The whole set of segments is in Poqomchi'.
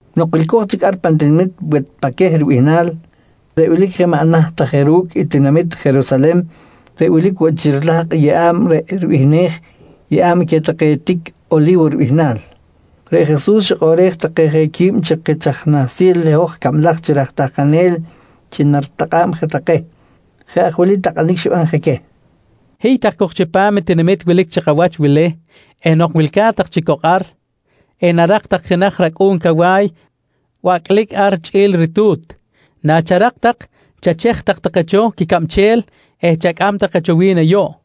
Nok wilco̱j chic ar pan tinamit Wetpaqueh ribihnal reꞌ wilic je maꞌ naht ta je ru̱cꞌ i tinamit Jerusalen reꞌ wilic woꞌ chi rilahkꞌ i yeꞌa̱b reꞌ ribihnej “Yeꞌa̱b queh take tic Oli̱wo ribihnal”, reꞌ Jesus xikꞌoꞌrej take je quib chi kich nahsil i hoj cablaj chi raj tahkanel chi naritakꞌa̱b je take. Jeꞌ aj wili takꞌanic xiban je queh: «Hiy tak cok chipam i tinamit wilic chi kawach wili eh nok wilca̱t tak chic cok ar, enarak tak jenaj racꞌu̱n cawa̱y bacꞌlic ar chꞌi̱l i ritu̱t. Nacharak tak, chachej tak take cho quicabchel eh chacꞌam take cho wi̱n ayuꞌ.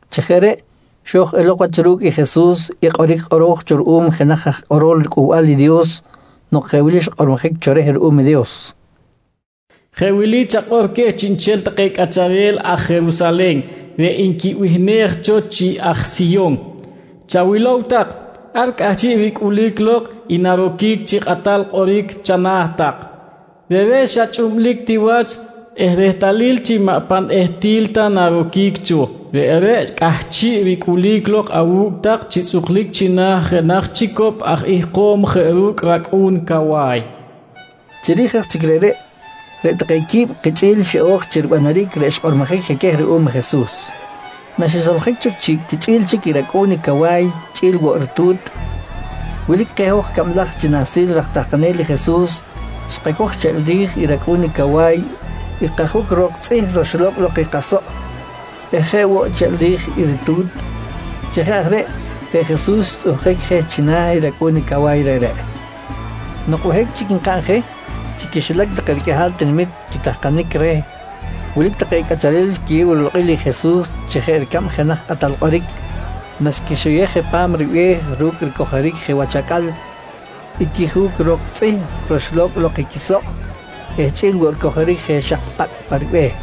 Chi jeꞌ reꞌ, xo̱j elok wach ru̱cꞌ i Jesus i kꞌoric kꞌoro̱j cho ruꞌum jenaj aj kꞌorol riCꞌuhbal i Dios nok jeꞌ wili xkꞌormojic cho reh ruꞌum i Dios: “Jeꞌ wili chakꞌor queh chiꞌnchel take cꞌacharel aj Jerusalen reꞌ nquibihnej cho chi aj Siyon: Chawilow tak, ar cꞌahchiꞌ ricꞌulic lok i naroquic chi kꞌatal kꞌoric chana̱ tak. Reꞌreꞌ xa chꞌublic ti wach eh rehtalil chi maꞌ pan ehtil ta naroquic cho, reꞌreꞌ cꞌahchiꞌ ricꞌulic lok awu̱cꞌ tak chi tzꞌuklic china̱ jenaj chicop aj ihkom jeꞌ ru̱cꞌ racꞌu̱n cawa̱y, nqui kꞌoro̱j cho reh. Chiri̱j aj chic reꞌreꞌ, reꞌ take quib kichꞌi̱l xiꞌo̱j chi ribanaric reꞌ xkꞌormojic je queh ruꞌum i Jesus. Naxisoljic cho chi quichꞌi̱l chic i racꞌu̱n i cawa̱y chꞌi̱l woꞌ i ritu̱t, wilic keh hoj cablaj chi nahsil raj tahkanel i Jesus xkacoj cheꞌl ri̱j i racꞌu̱n i cawa̱y i kajuc ro̱k tzꞌih roxlo̱cꞌ lok i kasoꞌ eh jeꞌ woꞌ cheꞌl ri̱j i ritu̱t. Chi jeꞌ aj reꞌ, reꞌ Jesus xtzꞌuhkic je china̱ i racꞌu̱n i cawa̱y reꞌreꞌ. Nok behic chic nkaꞌn je, chi quixilac take riqꞌuihal tinamit quitahkanic reh wilic take cꞌacharel xquiyew rilokꞌil i Jesus chi jeꞌ ricab jenaj kꞌatal kꞌoric naxquixoyej je pa̱m ribe̱h ru̱cꞌ ricojoric je wach acꞌal i quijuc ro̱k tzꞌih roxlo̱cꞌ lok i quisoꞌ eh chꞌi̱l woꞌ ricojoric je xak pacꞌ pa ribe̱h.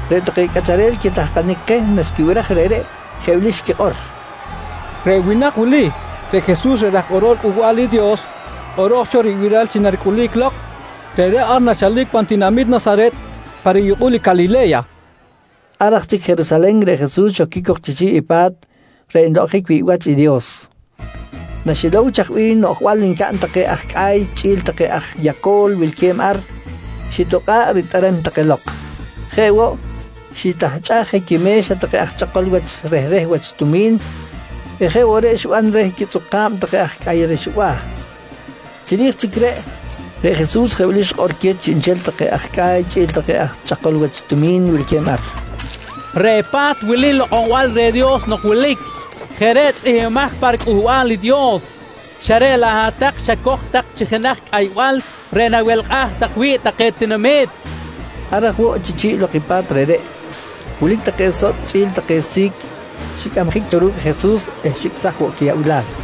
Reꞌ take cꞌacharel quitahkanic keh naxquibiraj reꞌreꞌ, jeꞌ wili xquikꞌor: «Reꞌ winak wili, reꞌ i Jesus reꞌ raj kꞌorol Cꞌuhbal i Dios kꞌoro̱j cho ribiral chi naricꞌulic lok. Reꞌreꞌ ar nchalic pan tinamit Nasaret pa riyukꞌul i Calile̱ya, nqui take. Ar aj chic Jerusalen, reꞌ Jesus xoquic cok chi chi̱ꞌ i pa̱t reꞌ nlokꞌonjic wi̱ꞌ wach i Dios. Naxilow chaj bih noꞌjbal ncaꞌn take aj cꞌa̱y chꞌi̱l take aj yaco̱l wilque̱b ar, xitokꞌa̱ꞌ ritꞌerem take lok. Jeꞌ woꞌ, xitahchꞌaj je quime̱xa take aj chꞌakol wach rehreh wach tumi̱n eh jeꞌ woꞌ reꞌ xiban reh quitzꞌuka̱b take aj cꞌa̱y rexba̱. Chiri̱j chic reꞌ, reꞌ Jesus je wili xikꞌor queh chiꞌnchel take aj cꞌa̱y chꞌi̱l take aj chꞌakol wach tumi̱n wilque̱b ar: «Reꞌ pa̱t wili lokꞌonbal reh Dios nok wilic. Jeꞌ reꞌ tzꞌihmbimaj pa riCꞌuhbal i Dios, xa reꞌ laꞌ hat-tak xacoj tak chi jenaj cꞌaybal reꞌ nawelkꞌaj tak wi̱ꞌ take tinamit, nqui queh. Ar aj woꞌ chi chi̱ꞌ lok i pa̱t reꞌreꞌ, wilic take sotꞌ chꞌi̱l take si̱c xicꞌamjic cho ru̱cꞌ i Jesus eh xicꞌsaj woꞌ quiyaꞌbilal.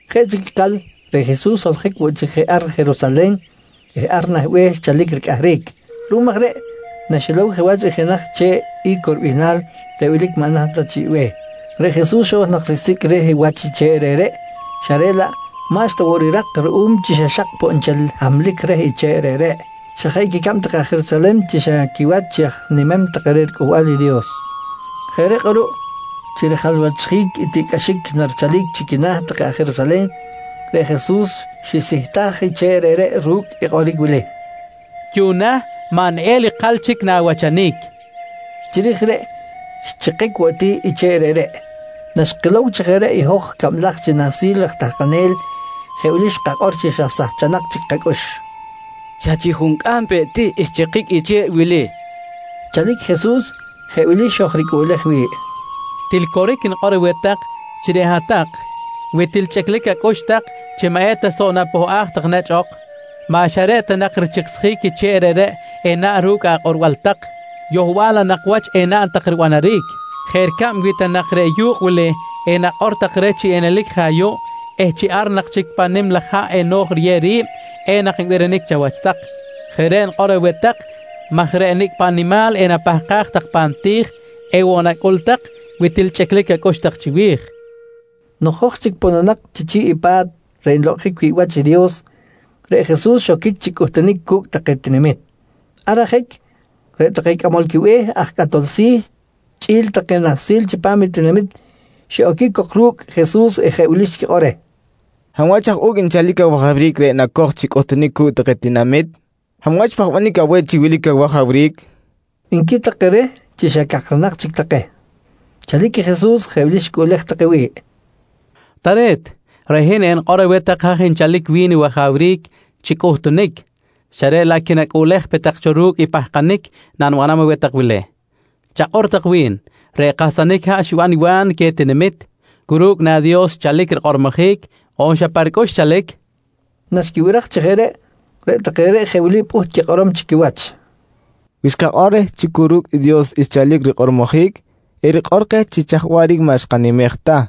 Jeꞌ chic ikal, reꞌ Jesus xsoljic woꞌ chic je ar Jerusalen eh ar nah be̱h xchalic ricꞌahric. Ruꞌum aj reꞌ, naxilow je wach i jenaj che̱ꞌ I̱co ribihnal reꞌ wilic maꞌ naht ta chiꞌ be̱h, reꞌ Jesus xo̱j nak risicꞌ reh wach i che̱ꞌ reꞌreꞌ xa reꞌ laꞌ maꞌxta woꞌ rirak ruꞌum chi xa xak poꞌ nchel hamlic reh i che̱ꞌ reꞌreꞌ, xa jeꞌ quicab take aj Jerusalen chi xa quiwach chi aj nimem take reh riCꞌuhbal i Dios. Jeꞌ reꞌ kꞌuruꞌ chi rijalwachjic i tiꞌcꞌaxic narichalic chi quina̱ take aj Jerusalen, reꞌ Jesus xisihtaj i che̱ꞌ reꞌreꞌ ru̱cꞌ i kꞌoric wili: «Yuꞌna maꞌ neꞌel ikal chic na̱wachanic, nqui xikꞌor reh. Chiri̱j reꞌ xchikic woꞌ ti i che̱ꞌ reꞌreꞌ. Naxkilow chi jeꞌ reꞌ i hoj cablaj chi nahsil raj tahkanel jeꞌ wili xkakꞌor chi xa sahchanak chic kacꞌux: «Xa chi juncꞌam peꞌ ti xchikic i che̱ꞌ wili, nqui xkakꞌor. Chalic Jesus, jeꞌ wili xojricꞌuꞌlej wi̱ꞌ: «Til coric nikꞌor aweh tak chi reꞌ hat-tak, wi til chꞌiclic acꞌux tak chi maꞌ eta soꞌ napohꞌaj tak nechꞌ ok, maꞌ xa reꞌ ta nak richiksjic i che̱ꞌ reꞌreꞌ enaꞌn ru̱cꞌ akꞌorbal tak, yohbal laꞌ nak wach enaꞌn tak ribanaric. Jeꞌ ricab wi ta nak reh yu̱kꞌ wili enakꞌor tak chi narelic je ayuꞌ eh chi ar chic pan nim laj haꞌ eno̱j riyew ri̱b, enak nbirinic chawach tak. Jeꞌ reꞌ nikꞌor aweh tak maj reꞌ nicꞌ paꞌ nimal enapahkaj tak pan ti̱j, ewoꞌ nacꞌul tak wi til chꞌiclic acꞌux tak chiwi̱j, nqui keh. Nok hoj chic pononak chi chi̱ꞌ i pa̱t reꞌ nlokꞌonjic wi̱ꞌ wach i Dios, reꞌ Jesus xoquic chi cꞌuhtunic cu̱cꞌ take tinamit. Ar ajic, reꞌ take cꞌamol quibe̱h aj cꞌatol si̱ chꞌi̱l take nahsil chipam tinamit xiꞌoquic cok ru̱cꞌ Jesus eh jeꞌ wili xquikꞌor reh: «Hab wach aj u̱cꞌ nchalic awajawric reꞌ nacoj chi cꞌuhtunic cu̱cꞌ take tinamit? Hab wach xpahbanic aweh chi wilic awajawric? nqui take reh chi xa cakranak chic take. Chalic Jesus, jeꞌ wili xicꞌuꞌlej take wi̱ꞌ: «Tare̱t, reꞌ hin enikꞌor aweh tak haj nchalic wi̱n i wajawric chi cꞌuhtunic, xa reꞌ laꞌ quinacꞌuꞌlej pe tak cho ru̱cꞌ i pahkanic nanibanam aweh tak wili: Chakꞌor tak cho wi̱n, reꞌ kahsanic haꞌ xiban i Wa̱n queh tinamit, cu ru̱cꞌ na Dios xchalic rikꞌormojic on xa pa ricꞌux xchalic? nqui queh. Naxquibiraj chi jeꞌ reꞌ, reꞌ take reꞌ jeꞌ wili pꞌuht quikꞌorom chi quiwach: «Wi xkakꞌor reh chi cu ru̱cꞌ Dios xchalic rikꞌormojic, erikꞌor keh chi chaj waꞌric maꞌ xkanimej ta.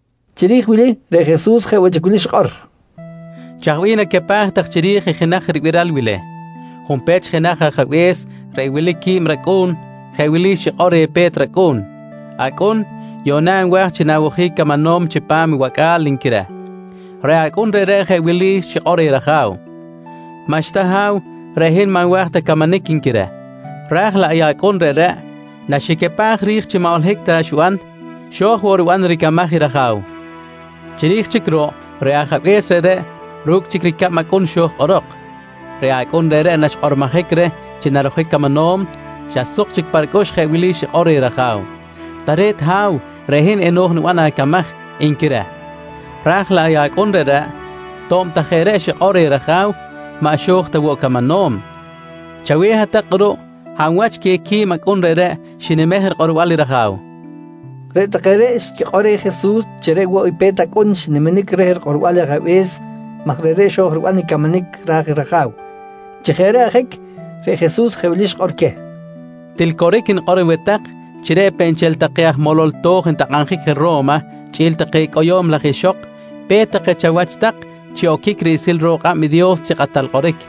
Chiri̱j wili reꞌ Jesus jeꞌ woꞌ chi wili xikꞌor: «Chaj bih nacapaj tak chiri̱j i jenaj ribiral wili? Junpech jenaj ajabe̱s reꞌ wilic qui̱b racꞌu̱n jeꞌ wili xikꞌor reh pe̱t racꞌu̱n: ‹Acꞌun, yuꞌna nwa̱j chi nawojic camanom chipam i wacꞌa̱l, nqui reh. «Reꞌ acꞌun reꞌreꞌ jeꞌ wili xikꞌor reh raja̱w: ‹Maꞌxta ha̱w, reꞌ hin maꞌ nwa̱j ta camanic, nqui reh. «Raj laꞌ i acꞌun reꞌreꞌ naxicapaj ri̱j chi maꞌ holohic ta xiban, xo̱j woꞌ riban ricamaj i raja̱w. Chiri̱j chic ruꞌ, reꞌ ajabe̱s reꞌreꞌ ru̱cꞌ chic i ricab acꞌun xo̱j kꞌorok. Reꞌ acꞌun reꞌreꞌ naxkꞌormojic reh chi narojic camanom, xa suk chic pa ricꞌux jeꞌ wili xikꞌor reh raja̱w: ‹Tare̱t ha̱w, reꞌ hin eno̱j niban acamaj, nqui reh. «Raj laꞌ i acꞌun reꞌreꞌ to̱b ta jeꞌ reꞌ xikꞌor reh raja̱w, maꞌ xo̱j ta woꞌ camanom. Chaweh hat-tak kꞌuruꞌ, hab wach queh qui̱b acꞌun reꞌreꞌ xinimej rikꞌorbal i raja̱w? nqui Jesus queh nahsil reꞌreꞌ. Reꞌ take reꞌ xquikꞌor reh Jesus chi reꞌ woꞌ i pe̱t acꞌun xniminic reh rikꞌorbal ajabe̱s maj reꞌreꞌ xo̱j riban i camanic ra̱j i raja̱w. Chi jeꞌ reꞌ ajic, reꞌ Jesus jeꞌ wili xikꞌor queh: «Til coric nikꞌor aweh tak chi reꞌ peꞌ nchel take aj molol to̱j ntakꞌabjic je Ro̱ma chꞌi̱l take cꞌoyo̱m laj ixok pe̱t take chawach tak chi oquic riꞌsil ro̱k kꞌab i Dios chi kꞌatal kꞌoric.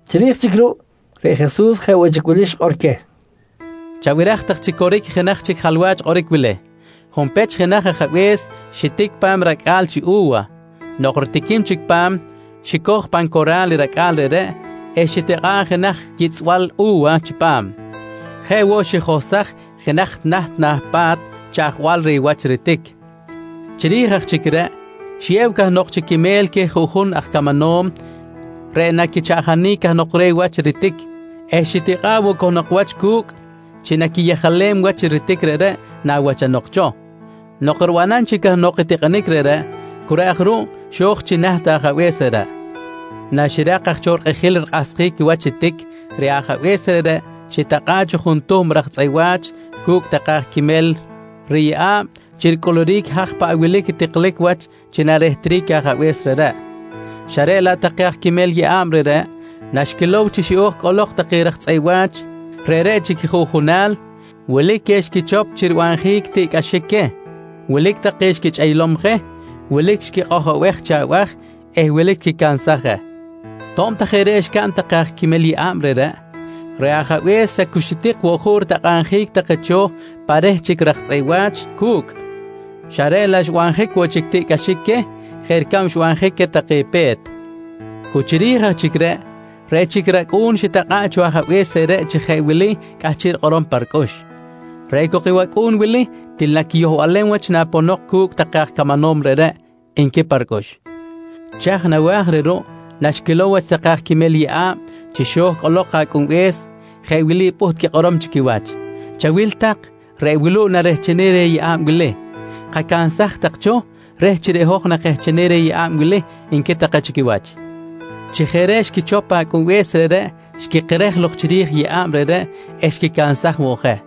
Chiri̱j chic ruꞌ, reꞌ Jesus jeꞌ woꞌ chic wili xikꞌor queh: «Chabiraj tak chi coric i jenaj chic jalwach kꞌoric wili: Junpech jenaj ajabe̱s xitic pa̱m i racꞌa̱l chi u̱wa. Nok ritiquim chic pa̱m, xicoj pan cora̱l i racꞌa̱l reꞌreꞌ eh xitikꞌa̱ꞌ jenaj yitzꞌbal u̱wa chipam. Jeꞌ woꞌ xijohsaj jenaj naht na̱ pa̱t chaꞌjbal reh wach ritic. Chiri̱j aj chic reꞌ, xiyew cahnok chi quimel queh juꞌjun aj camanom reꞌ naquichaꞌjanic cahnok reh wach ritic eh xitikꞌa̱ꞌ woꞌ cahnok wach cu̱cꞌ chi naquiyejalem wach i ritic reꞌreꞌ nawachanok cho. Nok ribanam chic cahnok i tikꞌinic reꞌreꞌ cu reꞌ aj ruꞌ xo̱j chi naht i ajabe̱s reꞌreꞌ. «Naxirak aj cho rikꞌijil rikꞌahsjic wach i tic, reꞌ ajabe̱s reꞌreꞌ xitakꞌa̱ꞌ cho juntuhm raj tzꞌeꞌ wa̱ch cu̱cꞌ take aj quimel riyeꞌa̱b chi ricꞌuluric i haj paꞌ wilic i tiklic wach chi narehtric i ajabe̱s reꞌreꞌ, xa reꞌ laꞌ take aj quimel yeꞌa̱b reꞌreꞌ, naxquilow chi xiꞌo̱j cꞌolok take aj tzꞌeꞌ wa̱ch reꞌreꞌ chi quijuꞌjunal, wilic queh xquichop chi ribanjic tiꞌcꞌaxic queh. Wilic take xquichꞌeylom je, wilic xquikꞌojobej je chi abaj eh wilic xquicansaj je. To̱b ta jeꞌ reꞌ xcaꞌn take aj quimel yeꞌa̱b reꞌreꞌ, reꞌ ajabe̱s xa cu xitik woꞌ juꞌ ritakꞌabjic take cho pa reh chic raj tzꞌeꞌ wa̱ch cu̱cꞌ, xa reꞌ laꞌ xbanjic woꞌ chic tiꞌcꞌaxic queh jeꞌ ricab xbanjic queh take pe̱t. Cu chiri̱j aj chic reꞌ, reꞌ chic i racꞌu̱n xitakꞌa̱ꞌ cho i ajabe̱s reꞌreꞌ chi jeꞌ wili cꞌahchiꞌ rikꞌorom pa ricꞌux: ‹Reꞌ cok i wacꞌu̱n wili til naquiyohlem wach naponok cu̱cꞌ take aj camanom reꞌreꞌ, nqui pa ricꞌux. «Chaj nawa̱j reh ruꞌ naxquilow take aj quimel yeꞌa̱b chi xo̱j cꞌolok i acꞌunbe̱s, jeꞌ wili pꞌuht quikꞌorom chi quiwach: ‹Chawil tak, reꞌ wuluꞌ narehchenic reh yeꞌa̱b wili. Kacansaj tak cho reh chi reꞌ hoj nakehchenic reh yeꞌa̱b wili, nqui take chi quiwach. «Chi jeꞌ reꞌ xquichop acꞌunbe̱s reꞌreꞌ, xquikerej lok chiri̱j i yeꞌa̱b reꞌreꞌ eh xquicansaj woꞌ je.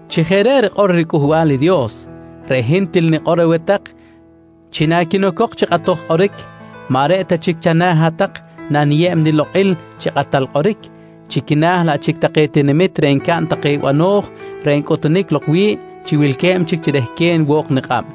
«Chi jeꞌ reꞌ rikꞌor riCꞌuhbal i Dios, reꞌ hin til nikꞌor aweh tak chi naquinocok chi kꞌatoj kꞌoric, maꞌ reꞌ ta chic chana̱ hat-tak naniyeb nilokꞌil chi kꞌatal kꞌoric, chi quina̱ laꞌ chic take tinamit reꞌ ncaꞌn take bano̱j reꞌ ncꞌutunic lok wi̱ꞌ chi wilque̱b chic chi rehquen wo̱k nikꞌab.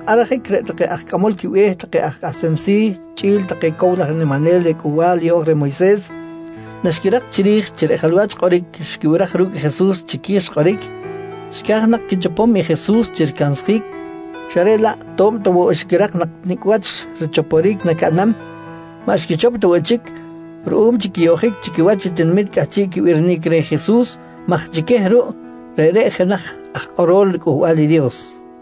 Ar ajic reꞌ take aj cꞌamol quibe̱h take aj kꞌahsem si̱ chꞌi̱l take cow laj aj niminel reh Cꞌuhbal Yeꞌo̱j reh Moyses, naxquirak chiri̱j chi reꞌ jalwach kꞌoric xquibiraj ru̱cꞌ Jesus, chiqui̱j xkꞌoric, xca̱j nak quichopom i Jesus chi ricansjic xa reꞌ laꞌ to̱b ta woꞌ xquirak nak nicꞌ wach richopjic nacaꞌnam, maꞌ xquichop ta woꞌ chic ruꞌum chi quiyoꞌjic chi quiwach i tinamit cꞌahchiꞌ quibirinic reh Jesus maj chi queh ruꞌ, reꞌreꞌ jenaj aj kꞌorol riCꞌuhbal i Dios.